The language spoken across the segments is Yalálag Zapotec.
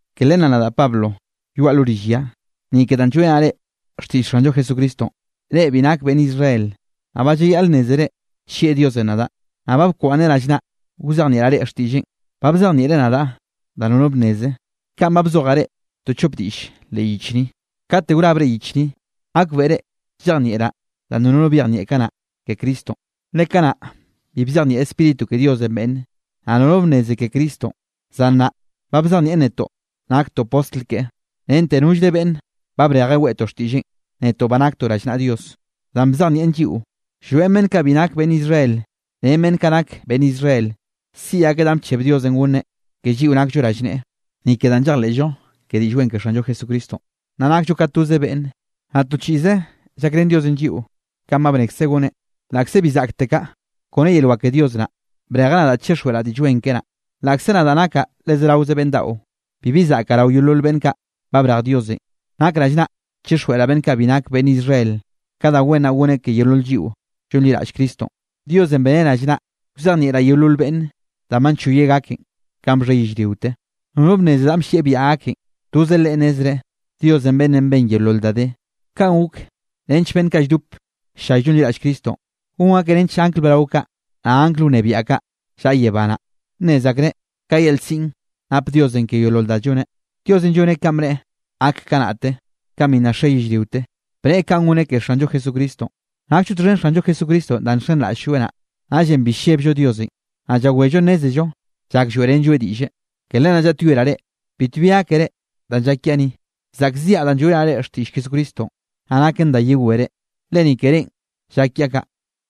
Ke len naꞌ nadaꞌ Pablo, yoaꞌ lo rill ya, ni ke danꞌ lloeꞌrenaꞌ reꞌ xtiꞌll Xanllo Jesucristonꞌ, reꞌ bi nake beꞌnn Israel. Naꞌ ba llayaꞌl nnézere nllieꞌ Diosenꞌ nadaꞌ, naꞌ ba bkwaꞌnneꞌ rallnaꞌ wzejnieꞌraꞌ reꞌ xtiꞌlleꞌn. Ba bzejnieꞌreꞌ nadaꞌ da nono bnneze, kaꞌn ba bzojaꞌ reꞌ to chop diꞌll leꞌ yich ni. Kate wrabre yich ni, gakbeꞌre llejnieꞌraꞌ danꞌ nono byejnieꞌ kanaꞌ ke Cristonꞌ. Le kanaꞌ bi bzejnieꞌ Spíritu ke Diosenꞌ beꞌnne, naꞌ nono bnneze ke Cristonꞌ. Zan nnaꞌ ba bzejnieꞌn netoꞌ naktoꞌ postl keꞌe, rente nollre beꞌnn ba brejeꞌ weꞌtoꞌ xtiꞌlleꞌn, netoꞌ ba naktoꞌ rallnaꞌa Dios. Danꞌ bzejnieꞌn lliꞌo, llroeꞌn beꞌnn kaꞌ bi nak beꞌnn Israel ren beꞌnn kaꞌ nak beꞌnn Israel, siꞌi akeꞌ danꞌ bcheb Diosenꞌ gonneꞌ ke lliꞌo nakllo rallneꞌe, ni ke danꞌ llejleꞌllo ke Diꞌll Wen ke Xanllo Jesucristonꞌ, naꞌ nakllo ka toz beꞌnne, naꞌ to chiꞌze llakrén Diosenꞌ lliꞌo kanꞌ ba bnekzeꞌ goneꞌ. Laꞌkze bi zaꞌktekaꞌ, kone yel wak ke Dios naꞌ, brejeꞌ nadaꞌ chixjweꞌraꞌ Diꞌll Wen keꞌe naꞌ. Laꞌkze nadaꞌ nakaꞌ le zeraoze beꞌnn daꞌo, bibi zaꞌke rao yeolol beꞌnn kaꞌ ba brej Diosenꞌ, nak rallnaꞌ chixjweꞌraꞌ beꞌnn kaꞌ bi nak beꞌnn Israel, ka da wen naꞌ goneꞌ ke yeolol lliꞌo llonliraꞌll Cristonꞌ. Diosenꞌ beneꞌ rallnaꞌ wzejnieꞌraꞌ yeolol beꞌnn danꞌ ba nchoyeꞌ gaken. Kanꞌ bxhe yellriote, nono bnneze danꞌ bllieꞌ biaꞌa gaken, toze Leꞌe nnezreꞌ, Diosenꞌ beꞌnnenꞌ ben yeolol da de. Kaꞌn gok nench beꞌnn kaꞌ lldop ll-llay llonliraꞌll Cristonꞌ, gon akeꞌ nench angl brao kaꞌ, naꞌ angl wnebiaꞌ kaꞌ llaꞌa yebá naꞌ, nnez akreꞌ ka yel siꞌn nap Diosenꞌ ke yeolol da lloneꞌ. Diosenꞌ lloneꞌ kanꞌ bneꞌe gak kanaꞌte, kanꞌ bi nna xe yellriote, bneꞌe kanꞌ goneꞌ ke Xanllo Jesucristonꞌ. Nakllo txhen Xanllo Jesucristonꞌ danꞌ nxenraꞌll-lloeꞌ naꞌ. Naꞌllenꞌ bi llebllo Diosenꞌ, naꞌ llawello nnézello llak lloeꞌrenlloeꞌ diꞌlle. Ke len naꞌ llaꞌtyoeraꞌ reꞌ, bitbi gákere danꞌ llak kiaꞌ ni, zaꞌkziaꞌ danꞌ lloeꞌrenaꞌ reꞌ xtiꞌll Jesucristonꞌ. Naꞌ naken da yewere, le ni ke reꞌn llak kiaꞌ kaꞌ.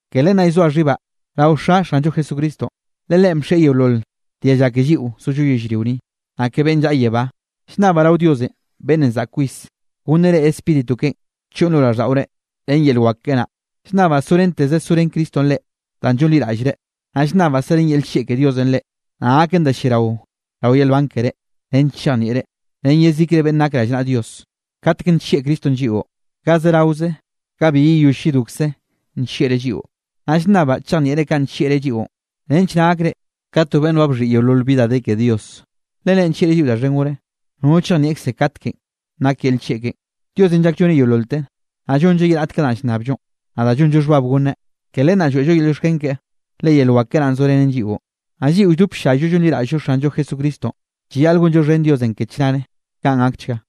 Ke len naꞌ llzoa xhibaꞌ rao Xa Xanllo Jesucristonꞌ. Le Leꞌen bxieꞌ yeolol dialla ke lliꞌo zollo yellrio ni, naꞌ ke beꞌnn llaꞌa yebá. Llnnabaꞌ rao Diosenꞌ beꞌnnenꞌ zaꞌk kwis, gonneꞌ reꞌ Spíritu keꞌen choꞌn lo raꞌlldaꞌorenꞌ ren yel wak keꞌe naꞌ. Llnnabaꞌ sorenteze sorén Cristonꞌ reꞌ, danꞌ llonliraꞌllreꞌ. Naꞌ llnnabaꞌ serén yel nllieꞌ ke Diosenꞌ reꞌ, naꞌ gaken da lliarao rao yel nban keré, nench chejnieꞌre, ren yezikre beꞌnne nak rallnaꞌa Dios, katek nllieꞌ Cristonꞌ lliꞌo. Ga zeraoze ga bi yeyoll yedokze nllieꞌreꞌ lliꞌo. Naꞌ llnnabaꞌ chejnieꞌre kanꞌ nllieꞌreꞌ lliꞌon, nench naꞌ gakre ka to beꞌnn ba bxhiꞌi yeolol bi da de ke Dios. Le Leꞌen nllieꞌre lliꞌo da xhen gore, nono chejnieꞌkze katkenꞌ nak yel nllieꞌ keꞌen. Diosenꞌ llak lloneꞌ yeololte, naꞌ llonnlleꞌ ye raꞌt ka danꞌ llnnabllonꞌ, naꞌ da llonllo xhbab gonneꞌ. Ke len naꞌ lloeꞌllo yel llioxken keꞌe, le yel wak keꞌe naꞌn zorenen lliꞌo. Naꞌ lliꞌo lldop ll-llayllo llonliraꞌll-llo Xanllo Jesucristonꞌ, llayaꞌl gonllo xhen Diosenꞌ ke chnare. Kaꞌn gakchga.